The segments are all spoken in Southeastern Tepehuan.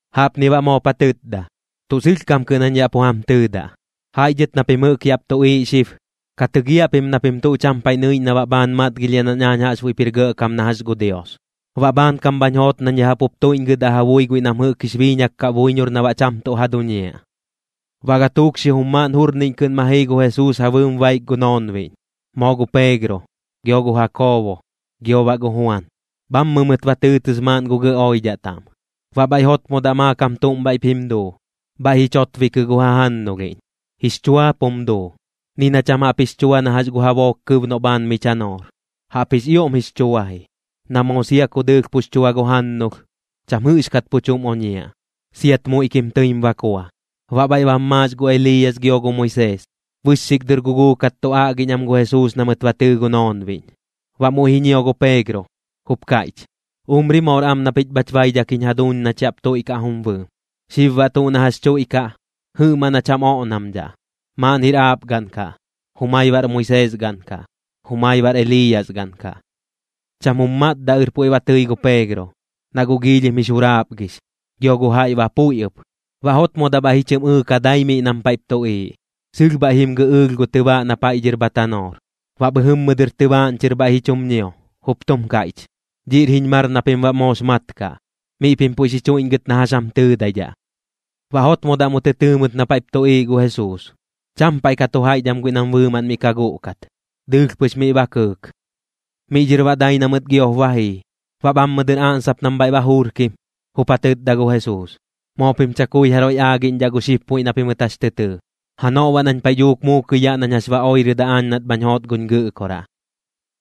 Jaꞌpni baꞌ moop ja tɨtda: ―Tuꞌ sɨlhkam kɨꞌn jañ yaꞌ pu jam tɨɨdaꞌ, jaiꞌ dhɨt na pim jɨꞌk yaꞌp tuꞌiiꞌ xib, ka tɨgiaꞌ pim na pim tuꞌ cham paiꞌ nɨiꞌñ na baꞌ bhaan matgilhiaꞌ nañ aañ jaꞌxbuiꞌp jir gɇꞌkam na jax gu Dios, baꞌ bhaankam bhañ joot nañ ya jaꞌp jup tuiꞌñgɨdaꞌ ja bui guiꞌ nam jɨꞌk jix biiñak kaꞌ buiñor na baꞌ cham tuꞌ ja duñiaꞌ. Baꞌ gatuuk xijum maaꞌn jurniꞌñ kɨꞌn ma jii gu Jesuus ja bɨɨm baik gu noonbiꞌñ, moo gu Peegro, gio gu Jakoobo, gio baꞌ gu Juan, bhammɨ mɨt ba tɨɨtɨs maaꞌn gu gɇꞌ oidhaꞌ taꞌm. Baꞌ bhaiꞌ jotmodaꞌ maakam tuꞌm bhaiꞌp jim duu, bhaiꞌ ji chotbikɨ gu jajannulhiꞌñ, jix chuaap jum duu, ni na cham jaꞌp jix chua na jax gu jabook kɨb noꞌ bhaan mi chanoor. Jaꞌp jix ioꞌm jix chua ji, na moo sia ku dɨɨlh pux chua gu jannulh, cham jɨꞌxkat pu chuꞌm oñiaꞌ, siat muiꞌkim tɨim bakua. Baꞌ bhaiꞌ bam maax gu Eliiyas gio gu Moisees, bɨxxik dɨr guguukat tu aꞌgiꞌñ am gu Jesuus na mɨt ba tɨɨ gu noonbiꞌñ. Baꞌ muiꞌ ji ñio gu Peegro, jup kaiꞌch: ―¡Umri moor am na pich bhach baidhak jiñ jaduuñ nach yaꞌp tuiꞌkaꞌ jum bɨɨm! Xib baꞌ tuꞌ na jax chuiꞌkaꞌ, jɨꞌmaꞌn jach jam oꞌnamdhaꞌ, maaꞌn jir aap gaꞌn kaꞌ, jumai baꞌr Moisees gaꞌn kaꞌ, jumai baꞌr Eliiyas gaꞌn kaꞌ. Cham jum matdaꞌɨr puiꞌ ba tɨi gu Peegro, na guꞌ giilhim jix juraapgix, gio gu jaiꞌ ba puiꞌ ɨp. Baꞌ jotmodaꞌ bhaiꞌ ji chɨ ɨɨka dai miꞌ nam paiꞌp tuꞌiiꞌ, sɨlh bhaiꞌ jim gɨꞌɨɨlh gu tɨbaaꞌ na paiꞌ dhɨr bha tanoor. Baꞌ bhɨjɨmmɨ dɨr tɨbaaꞌñ chɨr bhaiꞌ ji chum ñio, jup tum kaiꞌch: ―Dhiꞌr jiñ mar na pim baꞌ moox mat kaꞌ. Miꞌ pim puiꞌ xi chuiꞌñgɨt na jax jam tɨɨdaidhaꞌ. Baꞌ jotmodaꞌ mu tɨ tɨɨ mɨt na paiꞌp tuꞌiiꞌ gu Jesuus, cham paiꞌ ka tu jaiꞌch am guiꞌ nam bɨɨmaꞌn miꞌ ka guꞌkat. Dɨɨlh pɨx miꞌ ba kɨɨk. Miꞌ dhɨr baꞌ dai na mɨt giop ba jii. Baꞌ bhammɨ dɨr aꞌnsap nam bhaiꞌ ba juurkim, jup ja tɨtda gu Jesuus: ―Moo pim chakui jaroiꞌ aagiꞌñdhaꞌ gu xib puiꞌ na pimɨt jax tɨ tɨɨ. Janoꞌ baꞌ nañ paiꞌ dhuuk muukɨi yaꞌ nañ jax ba oirɨdaꞌ aañ nat bhañ joot guñ Gɨꞌkoraꞌ.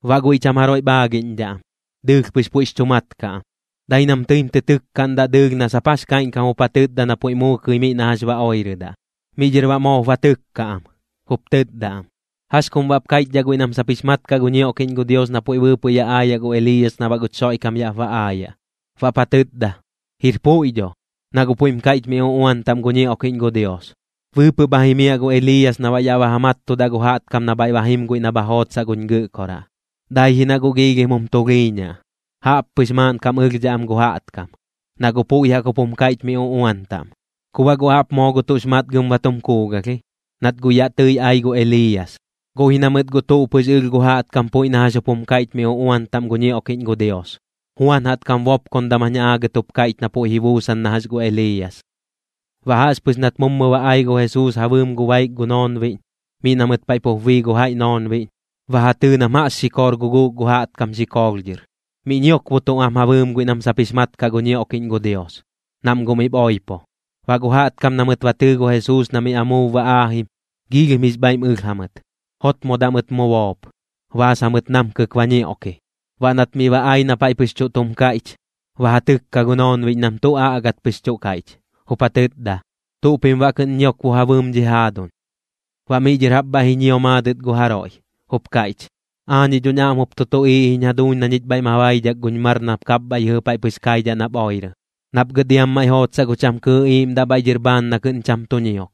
Baꞌ guiꞌ cham jaroiꞌp aagiꞌñdhaꞌ am, dɨɨlh pɨx puiꞌx chu mat kaꞌ am. Dai nam tɨim tɨ tɨkkaꞌndaꞌ dɨɨlh na sap jax kaiꞌñkam jup ja tɨtda na puiꞌ muukɨi miꞌ na jax ba oirɨdaꞌ. Miꞌ dhɨr baꞌ moop ba tɨkka am, jup tɨtda am: ―¿Jax kum baꞌp kaiꞌchdhaꞌ guiꞌ nam sap jix mat kaꞌ gu ñioꞌkiꞌñ gu Dios na puiꞌ bɨɨpɨꞌ yaꞌ aayaꞌ gu Eliiyas na baꞌ guch Xoiꞌkam yaꞌp ba aayaꞌ? Baꞌp ja tɨtda: ―Jir puiꞌ dho, na guꞌ puiꞌm kaiꞌch mi uꞌuan taꞌm gu ñioꞌkiꞌñ gu Dios. Bɨɨpɨꞌ bha jimiaꞌ gu Eliiyas na baꞌ yaꞌ ba ja mattudaꞌ gu jaꞌtkam na bhaiꞌ ba jim guiꞌ na bha jootsaꞌ guñ Gɨꞌkoraꞌ. Dai ji na guꞌ giilhim jum tulhiiñaꞌ, jaꞌppɨx maaꞌnkam ɨlhdhaꞌ am gu jaꞌtkam, na guꞌ puiꞌ jaꞌk jup jum kaiꞌch mi uꞌuan taꞌm. Ku baꞌ guꞌ jaꞌp moo gu tuꞌx matgam ba tum kuugalh ji, nat guꞌ yaꞌ tɨi ai gu Eliiyas, guꞌ ji na mɨt guꞌ tuꞌ pɨx ɨlh gu jaꞌtkam puiꞌ na jax jup jum kaiꞌch mi uꞌuan taꞌm gu ñioꞌkiꞌñ gu Dios. Juan jaꞌtkam bopkondam jañ aagɨt jup kaiꞌch na puiꞌ ji buusan na jax gu Eliiyas. Baꞌ jaꞌxpɨx nat mummu ba ai gu Jesuus ja bɨɨm gu baik gu noonbiꞌñ, miꞌ na mɨt paiꞌ pup bii gu jaiꞌ noonbiꞌñ, ba ja tɨɨ nam jaꞌx xikoor guguuk gu jaꞌtkam xikoolh dhɨr, miꞌ ñiokbotuꞌ am ja bɨɨm guiꞌ nam sap jix mat kaꞌ gu ñioꞌkiꞌñ gu Dios, nam guꞌ miꞌp oipo. Baꞌ gu jaꞌtkam na mɨt ba tɨɨ gu Jesuus na miꞌ amuub ba aajim, joidham jix bhaiꞌm ɨlh jamɨt. Jotmodaꞌ mɨt mu boop, baas jamɨt namkɨk ba ñioꞌki. Baꞌ nat miꞌ ba ai na paiꞌ pɨx tuꞌ tum kaiꞌch, ba ja tɨkka gu noonbiꞌñ nam tuꞌ aꞌgat pɨx tuꞌ kaiꞌch, jup ja tɨtda: ―¿Tuꞌ pim baꞌ kɨꞌn ñiokbo ja bɨɨm dhi jaaduñ? Baꞌ miꞌ dhɨr jaꞌp bhaiꞌ ji ñio maadɨt gu jaroiꞌ, jup kaiꞌch: ―Aañiꞌ dhoñ aꞌm jup tu tuꞌiiꞌ jiñ jaduuñ na ñich bhaiꞌ ma baidhak guñ mar nap kapbhaiꞌ yɨjɨ paiꞌ pɨx kaidhaꞌ nap oirɨ, nap gɨt iam maiꞌ jootsaꞌ gu cham kɨɨꞌ iiꞌmdaꞌ bhaiꞌ dhɨr bhaan na kɨꞌn cham tu ñiok.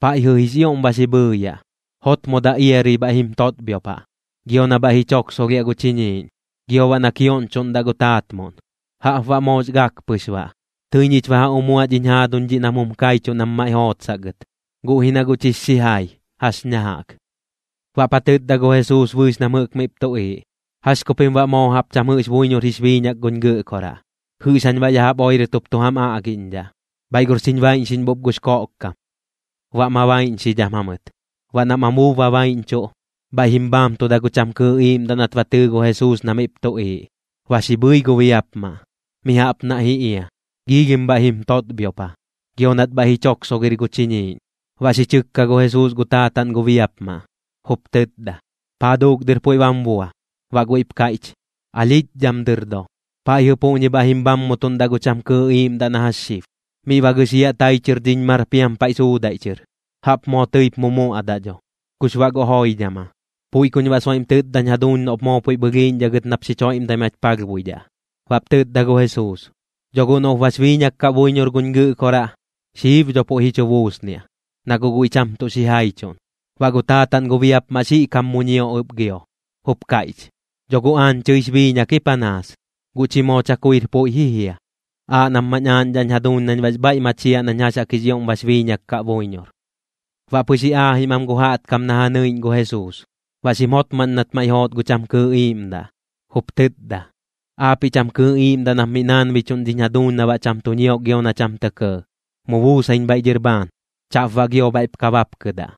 Paiꞌjɨ jix ioꞌm ba xi bhɨɨyaꞌ, jotmodaꞌ iarɨi bhaiꞌ jim totbhiopaꞌ, gio na bhaiꞌ ji choksolhiaꞌ gu chiñiiꞌñ, gio baꞌ na kioꞌñchoꞌndaꞌ gu taatmuꞌn. Jaꞌp baꞌ moox gak pɨx baꞌ. Tɨi ñich ba ja umuaꞌ dhiñ jaaduñ dhiꞌ nam jum kaichuꞌ nam maiꞌ jootsaꞌ gɨt, guꞌ ji na guꞌ chix xijai, jax ña jaꞌk. Baꞌp ja tɨtda gu Jesuus bɨɨx nam jɨꞌk miꞌp tuꞌiiꞌ: ―¿Jax ku pim baꞌ moo jaꞌp cham jɨꞌx buiñor jix biiñak guñ Gɨꞌkoraꞌ? ¿Jɨꞌx jañ baꞌ ya jaꞌp oirɨt jup tu jam aagiꞌñdhaꞌ? Bhaiꞌ gor xiñ baiꞌñxiꞌñbup gux koꞌkkam. Baꞌ ma baiꞌñxidham jamɨt. Baꞌ nam amuub ba baiꞌñchuꞌ, bhaiꞌ jim bhaamtuda gu cham kɨɨꞌ iiꞌmdaꞌ nat ba tɨɨ gu Jesuus na miꞌp tuꞌiiꞌ. Ba xi bhɨi gu biapmaꞌ, mi jaꞌp naiꞌ ji ia, giilhim bhaiꞌ jim totbhiopa, gio nat bhaiꞌ ji choksogir gu chiñiiꞌñ. Baꞌ xi chɨkka gu Jesuus gu taataꞌn gu biapmaꞌ, jup tɨtda: ―¿Paa duuk dɨr puiꞌ bam bua? Baꞌ guiꞌp kaiꞌch: ―Alhiꞌch dhɨm dɨr do. Paiꞌjɨ puꞌñi bhaiꞌ jim bhammutuꞌndaꞌ gu cham kɨɨꞌ iiꞌmdaꞌ na jax xib, miꞌ ba gɨxiaꞌ tai chɨr dhiñ mar piam paiꞌ suudaiꞌ chɨr. Jaꞌp moo tɨip mumuaꞌdaꞌ dho, kux baꞌ gu joidham aa. Puiꞌ kuñ baꞌ soiꞌm tɨtdañ jaduuñ noꞌp moo puiꞌp ɨlhiiꞌñdhaꞌ gɨt nap xich joiꞌmdai mach palhbuidhaꞌ. Baꞌp tɨtda gu Jesuus: ―Dho guꞌ noꞌp guꞌ bax biiñak kaꞌ buiñor guñ Gɨꞌkoraꞌ, xib dho puiꞌ ji chu buusniaꞌ, na guꞌ guiꞌ cham tuꞌ xijaichuꞌn. Baꞌ gu taataꞌn gu biapmaꞌ xiꞌkam mu ñio ɨp gio, jup kaiꞌch: ―Dho guꞌ aañ chɨix biiñak ji panaas, guꞌ chi moo chakuir puiꞌ ji jia. Aaꞌ nap mañ aaꞌñdhaꞌñ jaduuñ nañ baꞌx bhaiꞌ machiaꞌ nañ jax jaꞌk jix ioꞌm bax biiñak kaꞌ buiñor. Baꞌ pɨx ji aajim am gu jaꞌtkam na ja nɨiꞌñ gu Jesuus, baꞌ xim jotmaꞌñ nat maiꞌ joot gu cham kɨɨꞌ iiꞌmdaꞌ, jup tɨtda: ―Aapiꞌ cham kɨɨꞌ iiꞌmdaꞌ nap miꞌ naanbichuꞌn dhiñ jaduuñ na baꞌ cham tu ñiok gio na cham tɇ kɇɇ, mu buusaiñ bhaiꞌ dhɨr bhaan. Chaꞌp baꞌ gio bhaiꞌp ka bapkɨdaꞌ.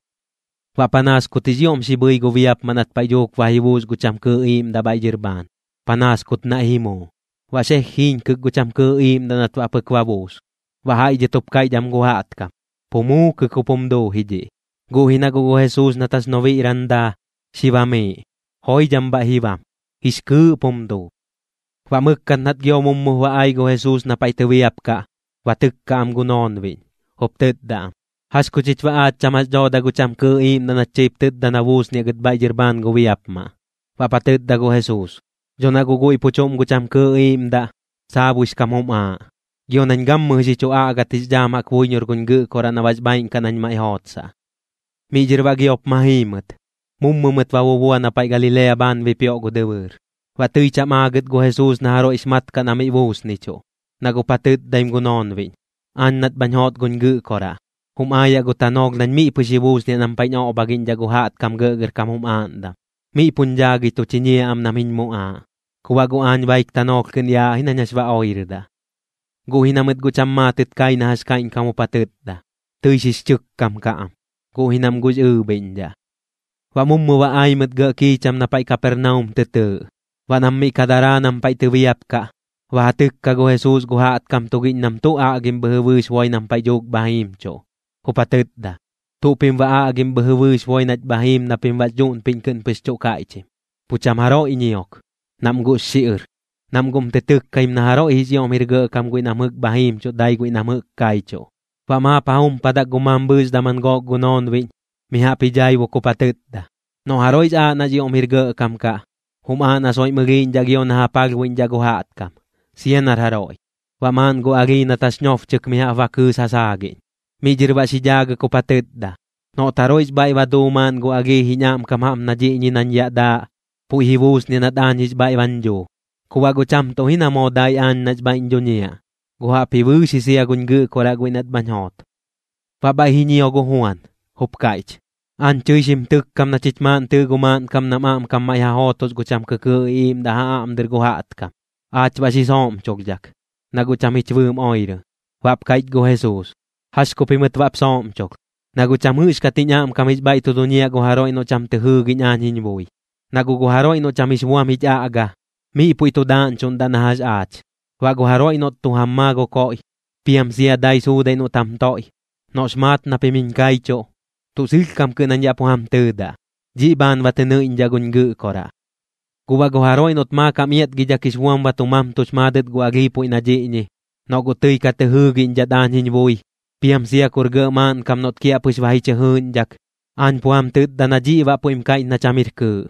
Baꞌ panaas kut jix ioꞌm ba xi bhɨi gu biapmaꞌ nat paiꞌ dhuuk ba ji buus gu cham kɨɨꞌ iiꞌmdaꞌ bhaiꞌ dhɨr bhaan, panaas kut naiꞌ ji muu. Baꞌ xeej jiiñkɨk gu cham kɨɨꞌ iiꞌmdaꞌ nat baꞌ pɨk ba buus. Baꞌ jaiꞌ dhɨt jup kaiꞌch am gu jaꞌtkam: ―Pu muukɨk jup jum duu ji dhiꞌ. Guꞌ ji na guꞌ gu Jesuus nat jax nobiꞌran daa, xi bamiiꞌ. Joidham bhaiꞌ ji bam, jix kɨɨꞌp jum duu. Baꞌ mɨkkat nat gio mummup ba ai gu Jesuus na paiꞌ tɨbiapkaꞌ, ba tɨkka am gu noonbiꞌñ, jup tɨtda am: ―¿Jax ku chich baꞌ aach cham jax dhooda gu cham kɨɨꞌ iiꞌmdaꞌ nach tɨip tɨtda na buusniaꞌ gɨt bhaiꞌ dhɨr bhaan gu biapmaꞌ? Baꞌp ja tɨtda gu Jesuus: ―Dho na guꞌ guiꞌ pu chuꞌm gu cham kɨɨꞌ iiꞌmdaꞌ, saabuix kam jum aaꞌ, gio nañ gammɨjɨ xi chu aꞌgat jix dhaam jaꞌk buiñor guñ Gɨꞌkoraꞌ na baꞌx bhaaiꞌn kaꞌ nañ maiꞌ jootsaꞌ. Miꞌ dhɨr baꞌ giop ma jii mɨt, mummu mɨt ba bubua na paiꞌ Galilea bhaan bipioꞌ gu dɨbɨɨr. Baꞌ tɨi cham aagɨt gu Jesuus na jaroiꞌx mat kaꞌ na miꞌ buusnichuꞌ, na guꞌp ja tɨtdaim gu noonbiꞌñ: ―Aañ nat bhañ joot guñ Gɨꞌkoraꞌ, jum aayaꞌ gu tanoolh nañ miꞌ pɨx ji buusniaꞌ nam paiꞌñ oꞌbhagiꞌñdhaꞌ gu jaꞌtkam gɇꞌgɇrkam jum aaꞌndam. Miꞌ puñ dhaagɨi tu chiñiaꞌ am nam jiñ muꞌaaꞌ, ku baꞌ guꞌ aañ baik tanoolh kɨꞌn yaaꞌ ji nañ jax ba oirɨdaꞌ. Guꞌ ji na mɨt guꞌ cham maatɨt kai na jax kaiꞌñkam jup ja tɨtda. Tɨi xix chɨkkam kaꞌ am, guꞌ ji nam guꞌx ɨɨbhiꞌñdhaꞌ. Baꞌ mummu ba ai mɨt gɇꞌ kiicham na paiꞌ Kapernaum tɨ tɨɨꞌ. Baꞌ nam miꞌ ka daraa nam paiꞌ tɨbiapkaꞌ, ba ja tɨkka gu Jesuus gu jaꞌtkam tugiꞌñ nam tuꞌ aꞌgim bhɨjɨ bɨɨx boi nam paiꞌ dhuuk bha jimchuꞌ, jup ja tɨtda: ―¿Tuꞌ pim baꞌ aꞌgim bhɨjɨ bɨɨx boi nach bha jim na pim baꞌx dhuꞌnpiꞌñ kɨꞌn pɨx chuꞌ kaiꞌchim? Pu cham jaroiꞌ ñiok, nam guꞌx xiꞌɨr, nam guꞌm tɨ tɨkkaim na jaroiꞌ jix ioꞌm jir gɇꞌkam guiꞌ nam jɨꞌk bha jiimchuꞌ dai guiꞌ nam jɨꞌk kaichuꞌ. Baꞌ maap ja jumpadak gu mambhɨɨx daman gook gu noonbiꞌñ, mi jaꞌp ji dhaibuk jup ja tɨtda: ―Noꞌ jaroiꞌx aaꞌ nax ioꞌm jir gɇꞌkam kaꞌ, jum aaꞌ na soiꞌm ɨlhiiꞌñdhaꞌ gio na ja palhbuiꞌñdhaꞌ gu jaꞌtkam, sia nar jaroiꞌ. Baꞌ maaꞌn gu alhii nat jax nobchɨk mi jaꞌp ba kɨɨs ja saagiꞌñ. Miꞌ dhɨr baꞌ xi dhaagɨk jup ja tɨtda: ―Noꞌt jaroiꞌx bhaiꞌ ba duu maaꞌn gu alhii jiñ aꞌmkam jaꞌp na dhiꞌñi nañ yaꞌ daaꞌ, puiꞌ ji buusniaꞌ nat aañ jix bhaiꞌ bañ dhuu. Ku baꞌ guꞌ cham tuꞌ ji na moo dai aañ nax bhaiꞌñ dhuñiaꞌ, guꞌ jaꞌpji bɨɨx ji sia guñ Gɨꞌkoraꞌ guiꞌ nat bhañ joot. Baꞌ bhaiꞌ ji ñio gu Juan, jup kaiꞌch: ―Aañ chɨi xim tɨkkam na chich maaꞌn tɨɨ gu maaꞌnkam nam aꞌmkam maiꞌ ja jootos gu cham kɨkɨɨꞌ iꞌiiꞌmdaꞌ ja aꞌm dɨr gu jaꞌtkam. Aach baꞌ xi sooꞌmcholhdhak, na guꞌ cham jich bɨɨm oirɨ. Baꞌp kaiꞌch gu Jesuus: ―¿Jax ku pimɨt baꞌp sooꞌmchulh? Na guꞌ cham jɨꞌxkat jiñ aꞌmkam jix bhaiꞌ tu duñiaꞌ gu jaroiꞌ noꞌ cham tɨ jɨɨgiꞌñ aañ jiñ bui. Na guꞌ gu jaroiꞌ noꞌ cham jix buam jich aꞌga, miꞌ puiꞌ tu daꞌñchuꞌndaꞌ na jax aach. Baꞌ gu jaroiꞌ noꞌt tu jam maa gu koiꞌ, piam sia dai suudaiꞌ noꞌt jam toiꞌ, noꞌx maat na pim jiñ kaichuꞌ, tuꞌ sɨlhkam kɨꞌn jañ yaꞌ pu jam tɨɨdaꞌ, dhiꞌ bhaan ba tɨ nɨiꞌñdhaꞌ guñ Gɨꞌkoraꞌ. ’Guꞌ baꞌ gu jaroiꞌ noꞌt maakam iatgidhak jix buam ba tu mamtux maadɨt gu alhii puiꞌ na dhiꞌñi, noꞌ guꞌ tɨi ka tɨ jɨɨgiꞌñdhat aañ jiñ bui, piam sia kur gɇꞌ maaꞌnkam noꞌt kiaꞌpɨx ba ji chɨ jɨɨꞌñdhak, aañ pu jam tɨtda na dhiꞌ baꞌ puiꞌm kaiꞌch na cham jir kɨɨꞌ.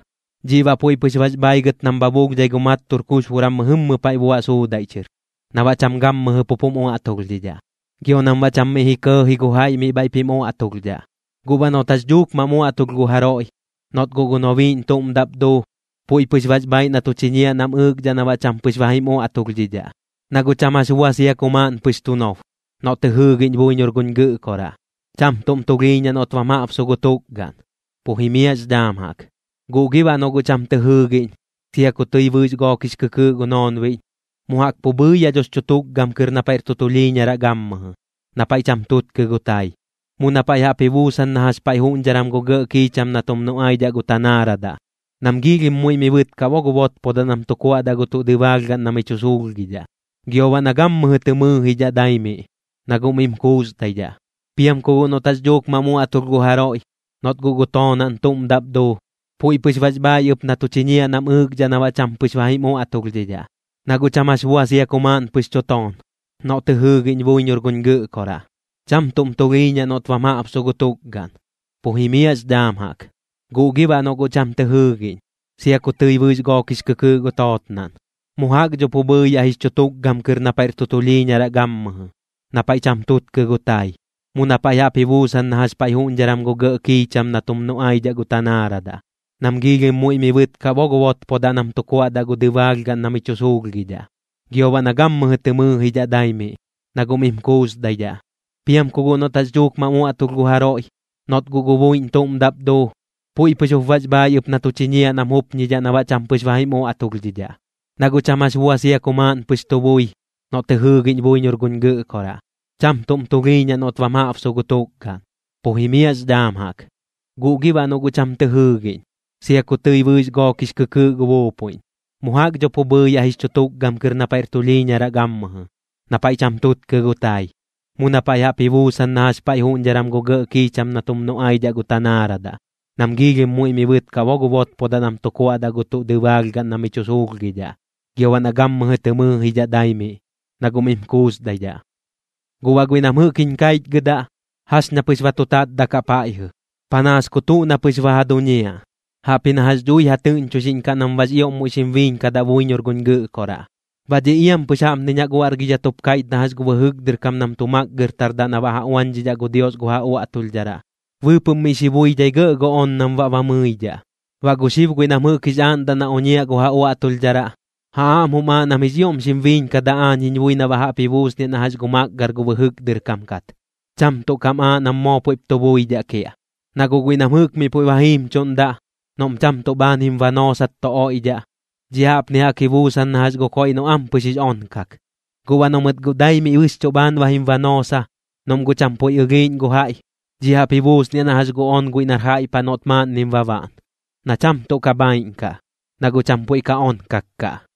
Dhiꞌ baꞌ puiꞌ pɨx bax bhaigɨt nam bha bulhdhai gu mattur kuxburan mɨjɨmmɨ paiꞌ buaꞌ suudaiꞌ chɨr, na baꞌ cham gammɨjɨ pup jum uaꞌtulhdhidhaꞌ, gio nam baꞌ cham miꞌ ji kɇɇji gu jaiꞌ miꞌ bhaiꞌp jim uaꞌtulhdhaꞌ. Guꞌ baꞌ noꞌt jax dhuuk mam uaꞌtulh gu jaroiꞌ, noꞌt guꞌ gu nobiiꞌñ chuꞌm daꞌp duu, puiꞌ pɨx bax bhaiꞌ na tu chiñiaꞌ nam ɨɨkdhaꞌ na baꞌ cham pɨx ba jim uaꞌtulhdhidhaꞌ. Na guꞌ cham jax bua sia ku maaꞌn pɨx tu nob, noꞌ tɨ jɨɨgiꞌñ buiñor guñ Gɨꞌkoraꞌ, cham tuꞌm tulhiiñaꞌ noꞌt bam jaꞌbsu gu tukgaꞌn, pu jimiaꞌx dhaam jaꞌk. Guꞌ gi baꞌ noꞌ guꞌ cham tɨ jɨɨgiꞌñ, sia ku tɨi bɨɨx gook jix kɨkɨɨꞌ gu noonbiꞌñ, mu jaꞌk pu bhɨɨyaꞌ dhox chu tukgam kɨr na paiꞌr tulhiiñaraꞌ gammɨjɨ, na paiꞌ cham tutkɨ gu tai, mu na paiꞌ jaꞌp ji buusan na jax paiꞌ juꞌñdharan gu gɇꞌ kiicham na tum nuꞌaidhaꞌ gu tanaaradaꞌ, nam giilhim muiꞌ mi bɨtkaꞌ bo gu botpodaꞌ nam tu kuaꞌdaꞌ gu tuꞌ dɨbaalhgaꞌn na mi chu suulhgidhaꞌ, gio baꞌ na gammɨjɨ tɨ mɨɨjidhaꞌ dai miꞌ, na guꞌ mim kuusdaidhaꞌ. Piam ku guꞌ noꞌt jax dhuuk mam uaꞌtulh gu jaroiꞌ, noꞌt guꞌ gu toonaꞌn tuꞌm daꞌp duu, puiꞌ pɨx bax bhaiꞌ ɨp na tu chiñiaꞌ nam ɨɨkdhaꞌ na baꞌ cham pɨx ba jim uaꞌtulhdhidhaꞌ. Na guꞌ cham jax bua sia ku maaꞌn pɨx chu toon, noꞌ tɨ jɨɨgiꞌñ buiñor guñ Gɨꞌkoraꞌ, cham tuꞌm tulhiiñaꞌ noꞌt bam jaꞌbsu gu tukgaꞌn, pu jimiaꞌx dhaam jaꞌk. Guꞌ gi baꞌ noꞌ guꞌ cham tɨ jɨɨgiꞌñ, sia ku tɨi bɨɨx gook jix kɨkɨɨꞌ gu tootnaꞌn, mu jaꞌk dho pu bhɨɨyaꞌ jix chu tukgam kɨr na paiꞌr tulhiiñaraꞌ gammɨjɨ, na paiꞌ cham tutkɨ gu tai, mu na paiꞌ jaꞌp ji buusan na jax paiꞌ juꞌñdharan gu gɇꞌ kiicham na tum nuꞌaidhaꞌ gu tanaaradaꞌ, nam giilhim muiꞌ mi bɨtkaꞌ bo gu botpodaꞌ nam tu kuaꞌdaꞌ gu dɨbaalhgaꞌn na mi chu suulhgidhaꞌ, gio baꞌ na gammɨjɨ tɨ mɨɨjidhaꞌ dai miꞌ, na guꞌ mim kuusdaidhaꞌ. Piam ku guꞌ noꞌt jax dhuuk mam uaꞌtulh gu jaroiꞌ, noꞌt guꞌ gu buiꞌñ tuꞌm daꞌp duu, puiꞌ pɨx jup bax bhaiꞌ ɨp na tu chiñiaꞌ nam jupñidhaꞌ na baꞌ cham pɨx ba jim uaꞌtulhdhidhaꞌ. Na guꞌ cham jax bua sia ku maaꞌn pɨx tu bui, noꞌ tɨ jɨɨgiꞌñ buiñor guñ Gɨꞌkoraꞌ, cham tuꞌm tulhiiñaꞌ noꞌt bam jaꞌbsu gu tukgaꞌn, pu jimiaꞌx dhaam jaꞌk. Guꞌ gi baꞌ noꞌ guꞌ cham tɨ jɨɨgiꞌñ, sia ku tɨi bɨɨx gook jix kɨkɨɨꞌ gu buupuiꞌñ, mu jaꞌk dho pu bhɨɨyaꞌ jix chu tukgam kɨr na paiꞌr tulhiiñaraꞌ gammɨjɨ, na paiꞌ cham tutkɨ gu tai, mu na paiꞌ jaꞌp ji buusan na jax paiꞌ juꞌñdharan gu gɇꞌ kiicham na tum nuꞌaidhaꞌ gu tanaaradaꞌ, nam giilhim muiꞌ mi bɨtkaꞌ bo gu botpodaꞌ nam tu kuaꞌdaꞌ gu tuꞌ dɨbaalhgaꞌn na mi chu suulhgidhaꞌ, gio baꞌ na gammɨjɨ tɨ mɨɨjidhaꞌ dai miꞌ, na guꞌ mim kuusdaidhaꞌ. ’Guꞌ baꞌ guiꞌ nam jɨꞌk jiñ kaichgɨdaꞌ, jax ña pɨx ba tu tatdakaꞌ paiꞌjɨ, panaas ku tuꞌ na pɨx jax ba ja duñiaꞌ, jaꞌp ji na jax dhui ja tɨꞌñchuixiꞌñkaꞌ nam baꞌx ioꞌm muiꞌ xim biiñkadaꞌ buiñor guñ Gɨꞌkoraꞌ. Baꞌ dhiꞌ iampɨx jaꞌpniñ jaꞌk uaꞌrgidhat jup kaiꞌch na jax gu bɨjɨk dɨr kam nam tu makgɨrtardaꞌ na baꞌ ja uañdhidhaꞌ gu Dios gu ja uaꞌtulhdharaꞌ, bɨɨpɨꞌm miꞌ xi buidhai gɇꞌ gu on nam baꞌ ba mɨidhaꞌ. Baꞌ gu xib guiꞌ nam jɨꞌk jix aaꞌndaꞌ na oñiaꞌ gu ja uaꞌtulhdharaꞌ, ja aꞌm jum aaꞌ nam jix ioꞌm xim biiñkadaꞌ aañ jiñ bui na baꞌ jaꞌp ji buusniaꞌ na jax gu makgɨr gu bɨjɨk dɨr kam kat, cham tuꞌ kam aaꞌ nam moo puiꞌp tu buidhaꞌ kiaꞌ. Na guꞌ guiꞌ nam jɨꞌk miꞌ puiꞌ ba jimchuꞌndaꞌ, noꞌm cham tuꞌ bhaan jim banoosat tu oiꞌdhaꞌ, dhiꞌ jaꞌpni jaꞌk ji busaak na jax gu koiꞌ noꞌ ampɨx jix onkak. Guꞌ baꞌ noꞌ mɨt guꞌ dai miꞌ bɨxchuꞌ bhaan ba jim banoosa, noꞌm guꞌ cham puiꞌ ɨlhiiꞌñ gu jaiꞌ, dhiꞌ jaꞌp ji buusniaꞌ na jax gu on guiꞌ nar jaiꞌ paꞌ noꞌt maaꞌnnim ba baꞌn, na cham tuꞌ ka bhaiꞌn kaꞌ, na guꞌ cham puiꞌ ka onkak kaꞌ.